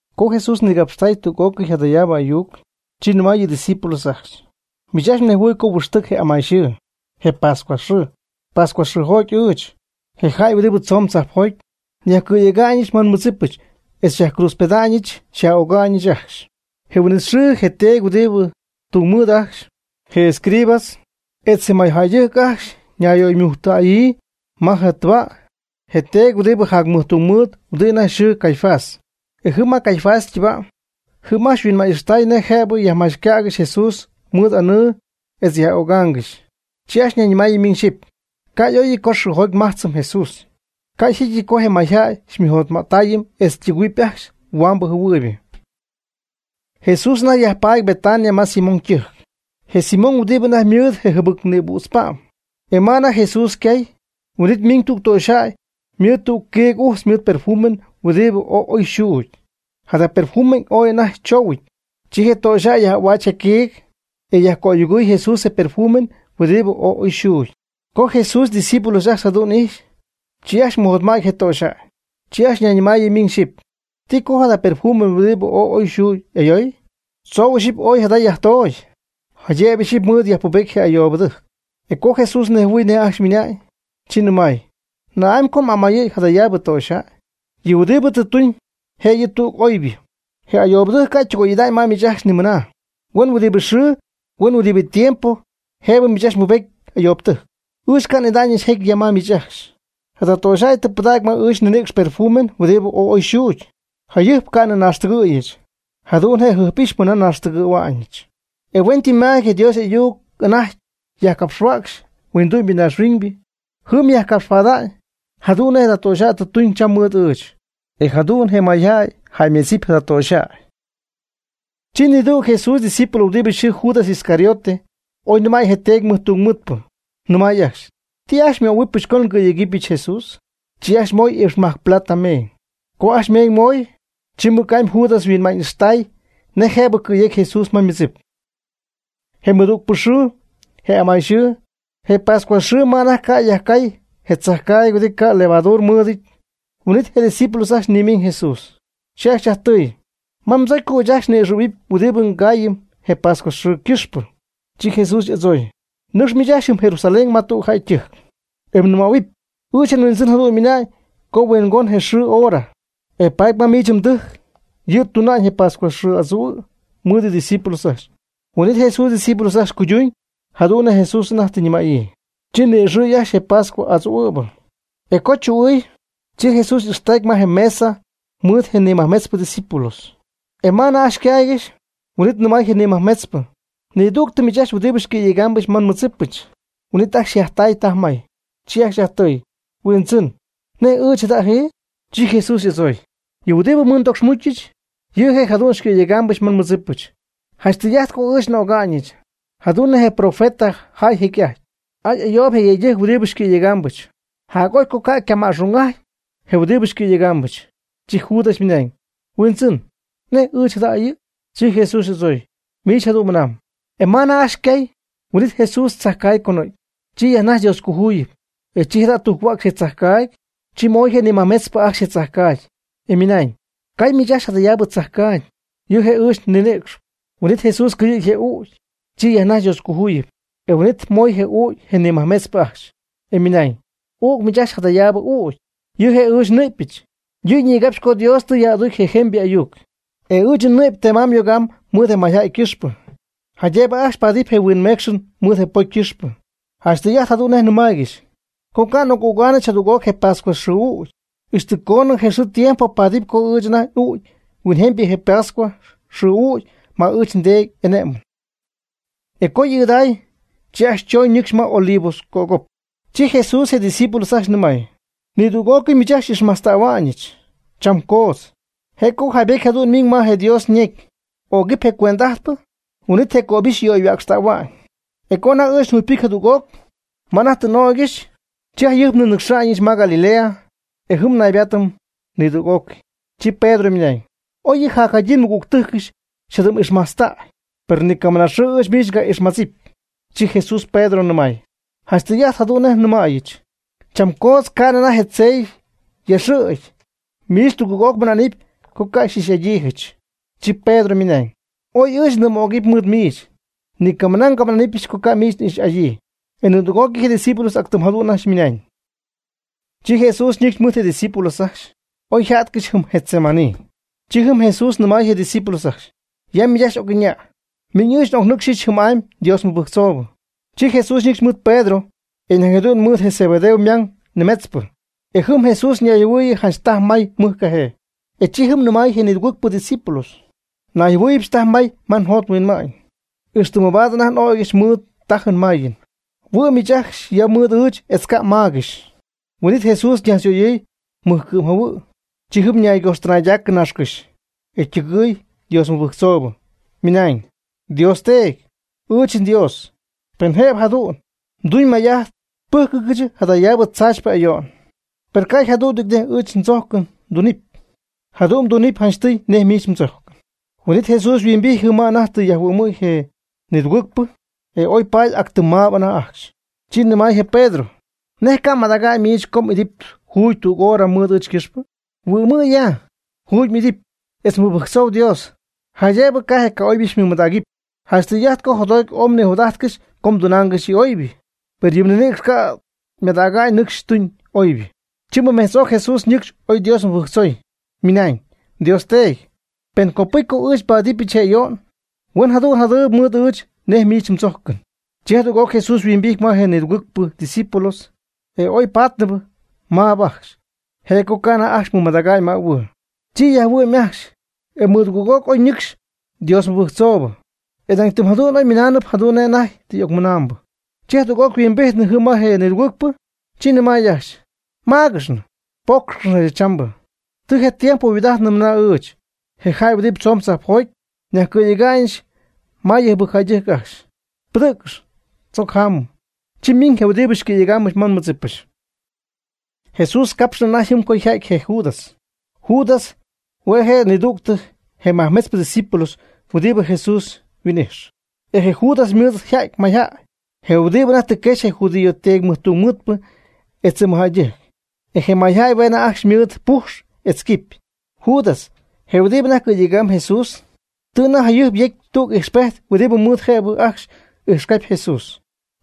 Co Jesús nigapxtay tüg'ócɨy jadayaabɨ ayuc, chi nɨmay yɨ' ydiscípulos ajcxy: ―Miich ajcxy mnejhuɨɨyb co huɨxtɨc je amayxɨɨ, je pascua xɨɨ. Pascua xɨɨjoty ɨɨch, je jäy huɨdibɨ tzoon tzajpjoty, nyajcɨ̈yega'ñɨch ma nmɨdzipɨch etz xyajcruutzpeda'ñɨch, xyaj'öga'ñɨch ajcxy. Je huin'it xɨɨ je teedy huɨdibɨ tungmɨɨd ajcxy, je escribas, etz je mɨjjäydɨjc ajcxy ñayyöymujctayɨ ma je' ytɨba' je teedy huɨdi jacmɨjtungmɨɨd huɨdi anajty yxɨɨ Caifás. E jɨm ma Caifás ytɨba' jɨm ajcxy huinma'ñy'ixtay nej jëbɨ yajmachycägɨxy Jesús mɨɨd anɨɨ etz yaj'ögaangɨxy. Chi ajcxy ñayñɨmaayɨ miñ xyɨpy: ―Ca' y'oyɨty co xɨɨjoty nmajtzɨm Jesús. Ca' jecyɨty co je mayjäy xymɨjotma'ttayɨm etz ytɨgɨ̈huɨp ajcxy huambɨ jɨhuɨɨybɨ. Jesús anajty yajpaady Betania ma Simón ytɨjc, je Simón huɨdibɨ anajty ymɨɨd je jɨbɨc nïbüdz pa'm. E ma anajty Jesús ycay, huin'it ymiiñ tüg töxyjäy mɨɨd tüg quiig ujtz mɨɨd perfume huɨdibɨ ooy oy yxuugy, jada perfume ooy anajty choohuɨty. Chi je töxyjäy yaj'ahuäch je quiig, e yajcöyogɨy Jesús je perfume huɨdibɨ ooy oy yxuugy. Co Jesús ydiscípulos ajcxy jadu'n ijxy, chi ajcxy mɨjotma'ty je töxyjäy. Chi ajcxy ñayñɨmaayɨ miñ xyɨpy: ―¿Ti co jada perfume huɨdibɨ ooy oy xuugy ayoy? Tzou ixyipy ooy jada yajtoocy, jaydëbɨ ixyipy mɨɨd yajpubet je ayoobɨtɨjc. E co Jesús nejhuɨɨy nej ajcxy ymɨnañ, chi nɨmay: ―¿Na'amy co m'amayɨ̈y jadayaabɨ töxyjäy? Yɨ' huɨdibɨ tɨ tuñ, je' yɨ' tüg oybɨ. Je ayoobtɨjc ca' ytɨgoy'ida'ñ ma miich ajcxy nimɨna. Huen huɨdibɨ xɨɨ huen huɨdibɨ tiempo jëbɨ miich ajcxy mbubedɨpy ayoobtɨjc. Ɨɨch ca' n'ida'ñɨch jecy ya mɨɨd miich ajcxy. Jada töxyjäy tɨ pɨdägy ma ɨɨch nninïcx perfume huɨdibɨ ooy oy xuugy, jayɨjp ca'nɨ nnaaxtɨgɨ̈yɨch. Jadu'n je' jɨjp'ijxpy mɨna nnaaxtɨgɨ̈hua'ñɨch. E huentɨmma'amyɨty je Dios y'ayuc anajty yajcapxhuäcxy huindu'my naaxhuiñ jɨm yajnigapxa'ñ jadu'n nej je töxyjäy tɨ tuñ cham mɨɨd ɨɨch, e jadu'n je mayjäy jäymedzɨpy jada töxyjäy. Chi nidüg je' ydiscípulos huɨdibɨ yxɨɨ Judas Iscariote oy nɨmäy je teedy mɨjtungmɨɨdpɨ, nɨmay ajcxy: ―¿Ti ajcxy xymöhuɨbɨch co ngɨ̈yegɨpyɨch Jesús? Chi ajcxy moy iipxmajc plata meeñ. Co ajcxy meeñ ymooy, chi mɨc'amy Judas yhuinma'ñ'ixtay nej jëbɨ cɨ̈yecy Jesús ma ymɨdzip. Je ymɨdügpɨ xɨɨ, je amayxɨɨ, je pascua xɨɨ ma anajty yajcay je tzajcaagy huɨdi ca' levadura mɨɨdɨty, huin'it je' ydiscípulos ajcxy nimiiñ Jesús. Chi ajcxy yajtɨɨy: ―¿Ma mdzocy co ɨɨch ajcxy ni'ixɨ̈huɨp huidi mgayamy je pascua xɨɨ cɨxpɨ? Chi Jesús y'adzooy: ―Nɨcx miich ajcxy jɨm Jerusalén ma tüg jäy ytɨjc, e mnɨmähuɨp: “Ɨɨch nHuindzɨn jadu'n mɨnamb co yhuingoñ je' yxɨɨ yhora, e paady ma miich mdɨjc yɨ' tuna'ñ je pascua xɨɨ adzu'ajtɨn mɨɨd ydiscípulos ajcxy.” Huin'it Jesús ydiscípulos ajcxy cuyduñ jadu'n nej Jesús anajty tɨ ñɨmäyii. Chi ni'ixɨɨy ajcxy je pascua adzuu'ɨ̈bɨ. E co chu'ɨɨy, chi Jesús y'ixtacy ma je mesa mɨɨd je nimajmetzpɨ ydiscípulos. E ma anajty ycaaygɨxy, huin'it nɨmay je nimajmetzpɨ: ―Nidügtɨ miich ajcxy huɨdibɨ xycɨ̈yegaambɨch ma nmɨdzipɨch. Huin'it ajcxy yjajtay taj may. Chi ajcxy yajtɨɨy: ―Huindzɨn, ¿nej ɨɨch jada'jɨ? Chi Jesús y'adzooy: ―Yɨ huɨdi mɨɨd ndocxmucyɨch, yɨ' je' jadu'n xycɨ̈yegaambɨch ma nmɨdzipɨch. Janch tɨy'ajt co ɨɨch n'öga'ñɨch, jadu'n nej je profeta jaay jecy'ajty. ¡Ay ayoob je yëydɨjc huɨdi xycɨ̈yegaambɨch! Jac'oy co ca' ycama'xung'aty je huɨdibɨ xycɨ̈yegaambɨch. Chi Judas ymɨnañ: ―Huindzɨn, ¿nej ɨɨch jada'jɨ? Chi Jesús y'adzooy: ―Miich jadu'n mɨnamb. E ma anajty ajcxy ycay, huin'it Jesús tzajcaagy conɨ̈gy. Chi yajnajxy Dioscojuyip. E chi jada' tujchuäcxy je tzajcaagy. Chi moy je nimajmetzpɨ ajcxy je tzajcaagy, e ymɨnañ: ―Cay miich ajcxy jadayaabɨ tzajcaagy, yɨ' je' ɨɨch je nninïcxɨch. Huin'it Jesús cɨyɨ̈gy je y'ügy. Chi yajnajxy Dioscojuyip. E huin'it moy je ügy je nimajmetzpɨ ajcxy, e ymɨnañ: ―Üc miich ajcxy jadayaabɨ ügy, yɨ' je' ɨɨch je nnɨ'pyɨch. Yɨ' ñigapxy co Dios tɨ yaj'aducy je jemybɨ ayuc. E ɨɨch nnɨ'py ytema'ñ yoga'ñ mɨɨd je mayjäy ycɨxpɨ, jaydëbɨ ajcxy paadɨp je huinmeecxɨn mɨɨd je ypocy ycɨxpɨ. Janch tɨy'ajt jadu'n nej nnɨmaaygɨxy, co ca' n'oc'ügaanɨch jadüg'oc je pascua xɨɨ ügy, ixtɨ coonɨ je xɨɨ tiempo paadɨp co ɨɨch ajt n'uucɨm huinjemybɨ je pascua xɨɨ ügy ma ɨɨch nDeedy y'ane'mɨn. E co tɨ y'ɨɨdäy, chi ajcxy chooñ ñɨcxy ma Olivos cögop. Chi Jesús je' ydiscípulos ajcxy nɨmay: ―Nidüg'ócɨy miich ajcxy xy'ixmajtztähua'ñɨch cham coodz. Je' co jaaybejty jadu'n miiñ ma je Dios ñecy: “Ögɨp je cuend'ajtpɨ, huin'it je cöbixy yöyhuäcxtähua'ñ.” E co anajty ɨɨch njugypɨcyɨch jadüg'oc ma anajty tɨ n'ögyɨch, chi jayɨjpnɨ nnɨcxa'ñɨch ma Galilea, e jɨm naybaatɨm nidüg'ócɨy. Chi Pedro ymɨnañ: ―Oy yɨ jacjadyiibɨ mɨgügtɨjcɨch xyjadɨm'ixmajtztäy, per ni camɨna xɨɨ ɨɨch miich n'ixmadzɨpy. Chi Jesús Pedro nɨmay: ―Janch tɨy'ajt jadu'n nɨmäyɨch, cham coodz ca'nɨ anajty je tzey yaxɨ̈gy, miich tugɨɨg'oc mɨna'nɨp co ca' xy'ixy'adyiijɨch. Chi Pedro ymɨnañ: ―Oy ɨɨch ndɨm'ögɨp mɨɨd miich, ni camɨna ngamɨná'nɨbɨch co ca' miich n'ix'adyii. E nidüg'ócɨy je' ydiscípulos ac tɨm jadu'n ymɨnañ. Chi Jesús ñɨcxy mɨɨd je' ydiscípulos ajcxy, oy yja'tcɨxy jɨm Getsemaní. Chi jɨm Jesús nɨmay je ydiscípulos ajcxy: ―Ya miich ajcxy oc'ɨña', miin ɨɨch n'ocnɨcxyɨch jɨm'amy Dios mɨbɨjctzoobɨ. E chi Jesús ñɨcxy mɨɨd Pedro etz nañ jadu'n mɨɨd je Zebedeo ymang nimetzpɨ. E jɨm Jesús ñayjɨhuɨɨyɨ janch tajy may mɨj cajee. E chi jɨm yajnɨmay je nidugɨɨgpɨ discípulos: ―Nayjɨhuɨɨybɨch taj may ma njot nhuinma'ñ, ixtɨ mabaad anajty n'ögɨch mɨɨd tájɨn máyɨn. Huɨ'm miich ajcxy ya mɨɨd ɨɨch etz ca' mmaagɨxy. Huin'it Jesús ñajtzyöyɨɨy mɨjcɨ'm jahuɨ'. Chi jɨm ñaygojxtɨnaydacɨ naaxcɨ́xy, e ytɨgɨɨy Dios mɨbɨjctzoobɨ, ymɨnañ: ―Dios Teedy, ɨɨch nDios, pen jëbɨ jadu'n, mduñ may'ajt pɨ́jcɨgɨch jadayaabɨ tzaachypɨ ayo'n, per ca' yjadu'nɨty nej ɨɨch ndzojcɨn mdunɨpy, jadu'n mdunɨpy janchtɨy nej miich mdzojcɨn. Huin'it Jesús yhuimbijty jɨm ma anajty tɨ yajhuɨ'my je nidugɨɨgpɨ. E oy paady ac tɨm maab anajty ajcxy. Chi nɨmay je Pedro: ―¿Nej ca' madäga'ñ miich ajcxy co m'idɨpy juugy tüg hora mɨɨd ɨɨch ycɨxpɨ? Huɨ'mɨ' ya, juugy m'idɨpy etz mɨbɨjctzoo Dios, jaydëb ca' je ca'oybɨ xymɨmadägɨp. Janch tɨy'ajt co jotjoty ooy mnijot'ajtcɨxy com tunaangɨxy yɨ oybɨ. Per yɨ mninïcx ca' ymadäga'ñ nɨcxy tuñ oybɨ. Chi mɨmetz'oc Jesús ñɨcxy oy Dios mɨbɨjctzoy, ymɨnañ: ―Dios Teedy, pen copɨcy co ɨɨch nbaadɨbɨch je ayo'n, huen jadu'n yjadɨɨyb mɨɨd ɨɨch nej miich mdzojcɨn. Chi jadüg'oc Jesús huimbijty ma je nidugɨɨgpɨ discípulos, e oy pátnɨbɨ maab ajcxy, je' co ca' anajty ajcxy mɨmadägy mähuɨɨ. Chi yajhuɨ'my ajcxy, e mɨdugɨɨg'oc ñɨcxy Dios mɨbɨjctzoobɨ. E nañ tɨm jadu'n oy mɨnaanɨp jadu'n nej anajty tɨ y'ocmɨnamb. Chi jadüg'oc huimbijtnɨ jɨm ma je nidugɨɨgpɨ, chi nɨmay ajcxy: ―¿Máagɨxnɨ? Pócxcɨx jadachambɨ. Tɨ je tiempo yhuaad'ajtnɨ mɨna ɨɨch, je jäy huɨdibɨ tzoon tzajpjoty, nyajcɨ̈yega'ñɨch ma yɨ jɨbɨcjäydɨjc ajcxy. Pɨdɨ̈ccɨx, tzoc jámɨm, chi ymiiñ je huɨdibɨ xycɨ̈yegaambɨch ma nmɨdzipɨch. Jesús capxnɨ anajty jɨm co yjäty je Judas. Judas hue' je' nidügtɨ je majmetzpɨ discípulos huɨdibɨ Jesús yhuin'ijx. E je Judas mɨɨd ja'ty mayjäy, je huɨdibɨ anajty tɨ quexy je judío teedy mɨjtungmɨɨdpɨ etz je mɨjjäydɨjc. E je mayjäy hue' anajty ajcxy mɨɨd ypujx etz quipy. Judas, je huɨdibɨ anajty cɨ̈yejcp Jesús, tɨ anajty jayɨjp yecy tüg ijxpejt huɨdibɨ mɨɨd jëbɨ ajcxy ijxcapy Jesús.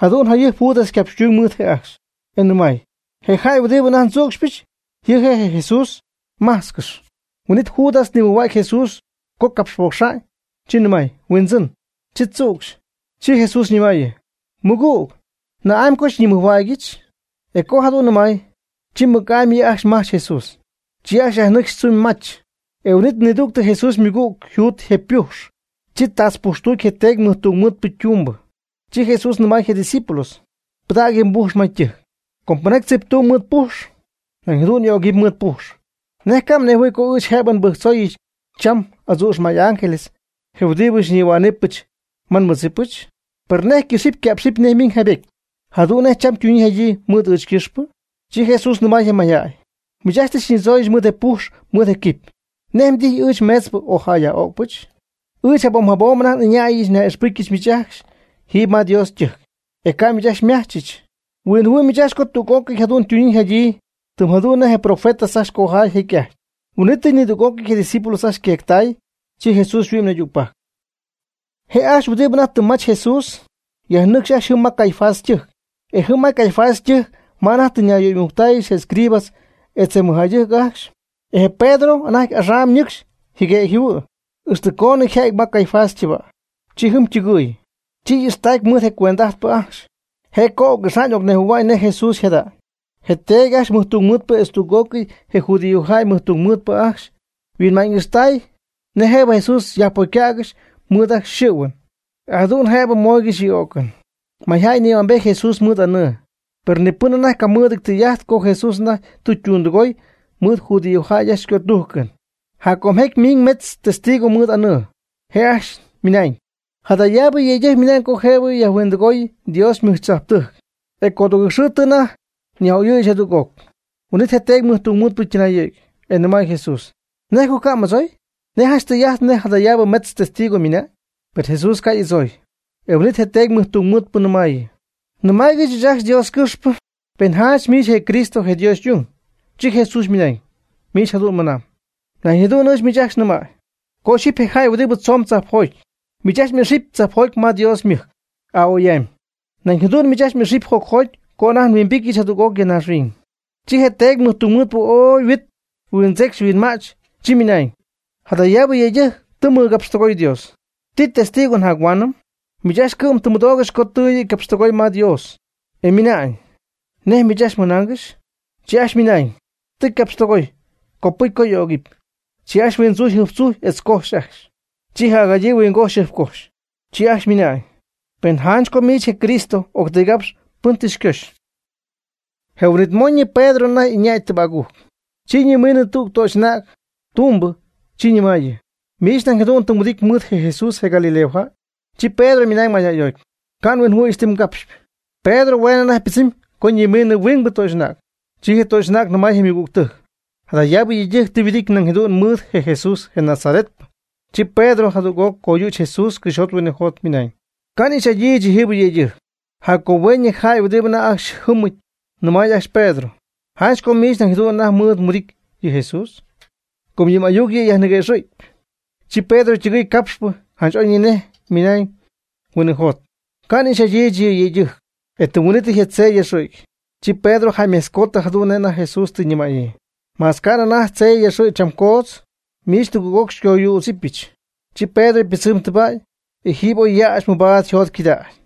Jadu'n jayɨjp Judas ycapxtuñ mɨɨd je' ajcxy, e ymɨnañ: ―Je jäy huɨdibɨ anajty ndzücxypɨch, yɨ' je' Jesús. Májtzcɨx. Huin'it Judas nimɨjhuägy Jesús co capxpocxa'ñ, chi ymɨnañ: ―¡Huindzɨn! Chi tzücxy. Chi Jesús ñɨmayɨ: ―Mɨgüg, ¿na'amy co xyñimɨjhuägyɨch? E co jadu'n nɨmay, chi mɨc'amy yɨ' ajcxy majch Jesús. Chi ajcxy yajnɨcxy tzumy mach. E huin'it nidüg je Jesús ymɨgüg, juudy je ypujx. Chi tatzpujxtucy je teedy mɨjtungmɨɨdpɨ ytumbɨ. Chi Jesús nɨmay je' ydiscípulo: ―Pɨdäg yɨ mbujx ma ytɨjc. Com pɨnjaty tziptumb mɨɨd pujx, nañ jadu'n y'ögɨpy mɨɨd pujx. ¿Nej ca' mnejhuɨ̈y co ɨɨch jëbɨ nbɨjctzooyɨch cham adzu'x may ángeles, je huɨdibɨ xyñihuá'nɨbɨch ma nmɨdzipɨch? ¿Per nej ycɨxɨpy yca'pxɨpy nej miiñ jaaybety, jadu'n nej cham ytuñyii yjadyii mɨɨd ɨɨch ycɨxpɨ? Chi Jesús nɨmay je mayjäy: ―Miich ajcxy tɨ xyñidzonɨ̈yɨch mɨɨd je pujx mɨɨd je quiipy. ¿Nej mdijy ɨɨch meetzpɨ o jäy yaj'öcpɨch? Ɨɨch jabom jabom anajty ɨñäyɨch nyaj'ixpɨcyɨch miich ajcxy jiiby ma Dios ytɨjc. E ca' miich ajcxy xymajchɨch. Huinjɨhuɨ' miich ajcxy co tüg'ócɨy yam ytuñyii yjadyii ca'px tɨm jadu'n nej je profeta ajcxy cojaay jecy'ajty. Huin'it nidüg'ócɨy je' ydiscípulos ajcxy yqueectay. Chi Jesús yhuɨ'my naydügpajc. Je' ajcxy huɨdibɨ anajty tɨ mach Jesús, yajnɨcx ajcxy jɨm ma Caifás ytɨjc. E jɨm ma Caifás ytɨjc ma anajty tɨ ñayyöymujctáayɨgɨxy je escribas etz je mɨjjäydɨjc ajcxy. E je Pedro anajty axam nɨcxy jɨguëgy jɨhuɨ̈y, ixtɨ coonɨ yajja'ty ma Caifás ytɨba'. Chi jɨm ytɨgɨy. Chi ixtacy mɨɨd je cuend'ajtpɨ ajcxy, je' co oc'ixa'ñ ocnejhuɨ̈hua'ñ nej Jesús yjada'ñ. Je teedy ajcxy mɨjtungmɨɨdpɨ etz tüg'ócɨy je judíojäy mɨjtungmɨɨdpɨ ajcxy huinma'ñ ixtaaygɨxy nej jëbɨ Jesús yajpocycägɨxy mɨɨd ajcxy xɨ̈huɨn, e jadu'n jëbɨ mooygɨxy yɨ o'cɨn. Mayjäy nïhuambejty Jesús mɨɨd anɨɨ, per ni pɨn anajty ca' mɨɨdɨty tɨy'ajt co Jesús anajty tɨ ytundɨgooy mɨɨd judíojäy ajcxy ycötujcɨn. Jac com jecy miin metz testigos mɨɨd aanɨɨ. Je' ajcxy ymɨnañ: ―Jadayaabɨ yëydɨjc mɨnañ co jëbɨ nyajhuindɨgooyɨch Dios ymɨjtzajptɨjc, e codugɨɨg xɨɨ tɨ anajty nyaj'oyɨ̈yɨch jadüg'oc. Huin'it je teedy mɨjtungmɨɨdpɨ ytɨnayɨ̈gy, e nɨmay Jesús: ―¿Nej co ca' m'adzooy? ¿Nej janch tɨy'ajt nej jadayaabɨ metzpɨ testigo ymɨna'ñ? Per Jesús ca' y'adzooy. E huin'it je teedy mɨjtungmɨɨdpɨ ñɨmaayɨ: ―Nɨmaayg ɨɨch ajcxy Dios ycɨxpɨ, pen janch miich je' je Cristo je Dios y'ung. Chi Jesús ymɨnañ: ―Miich jadu'n mɨnamb. Nañ jadu'n ɨɨch miich ajcxy nɨmäy, co ɨɨch je jäy huɨdibɨ tzoon tzajpjoty, miich ajcxy xy'ixɨpyɨch tzajpjoty ma Dios ymɨjc a'oy'amy. Nañ jadu'n miich ajcxy xy'ixɨpyɨch jocjoty co anajty nhuimbityɨch jadüg'oc ya naaxhuiñ. Chi je teedy jacmɨjtungmɨɨdpɨ oy yhuit huindzecxy huinma'ch, chi ymɨnañ: ―Jadayaabɨ yëydɨjc tɨ capxtɨgooy Dios. ¿Ti testigo njac-huaanɨm? Miich ajcxy cɨ'm tɨ mmɨdoogɨxy co yɨ' tɨ ycapxytɨgooy ma Dios, e minañ: ¿Nej miich ajcxy mɨnaangɨxy? Chi ajcxy ymɨnañ: ―Tɨ ycapxytigooy, copɨcy co y'ögɨpy. Chi ajcxy huindzujy jɨjptzujy etz cojxy ajcxy. Chi jacjadyii huingojxy jɨjpcojxy. E chi ajcxy nɨmay: ―Pen janch co miich je' je Cristo octɨygapx pɨn tɨ xycoxy. Je huin'it moñɨ Pedro anajty ɨñay tɨbägujc. Chi ñimiinɨ tüg töxy'anäg tumbɨ, chi ñɨmaayɨ: ―Miich nañ jadu'n tɨ mhuɨdity mɨɨd Jesús je Galilea jäy. Chi Pedro ymɨnañ mayjäyjoty: ―Ca' nhuinjɨhuɨ̈yɨch ti mgapxpy. Pedro hue' anajty pɨdzɨmnɨp co ñimiinɨ huingbɨ töxy'anäg. Chi je töxy'anäg nɨmay je' ymɨgügtɨjc: ―Jadayaabɨ yëydɨjc tɨ yhuɨdity nañ jadu'n mɨɨd Jesús je Nazaretpɨ. Chi Pedro jadüg'oc coyüch je Jesús cɨxyjot huinɨjot ymɨnañ: ―Ca' n'ixy'adyiijɨch yɨjiibɨ yëydɨjc. Jac co hueenɨ, je jäy huɨdibɨ anajty ajcxy jɨmɨp ñɨmay ajcxy je Pedro: ―Janch co miich nañ jadu'n anajty mɨɨd mhuɨdity yɨ Jesús, com yɨ m'ayuc yɨ' xyajniquëxɨ̈cp. Chi Pedro tɨgɨɨy capxpɨ janch oy ñinej mɨnañ huinɨjot: ―Ca' n'ix'adyiijɨch yɨ yëydɨjc. E tɨm huin'ítɨy je tzey yaxɨ̈gy. Chi Pedro jäymejtzcoody jadu'n nej anajty Jesús tɨ ñimäyii: “Ma ca'nɨ anajty tzey yaxɨ̈gy cham coodz, miich tugɨɨg'oc xycoyützɨbɨch.” Chi Pedro pɨdzɨmy tɨba', e jiiby oy yäxy mɨbaad yjotcɨdägy.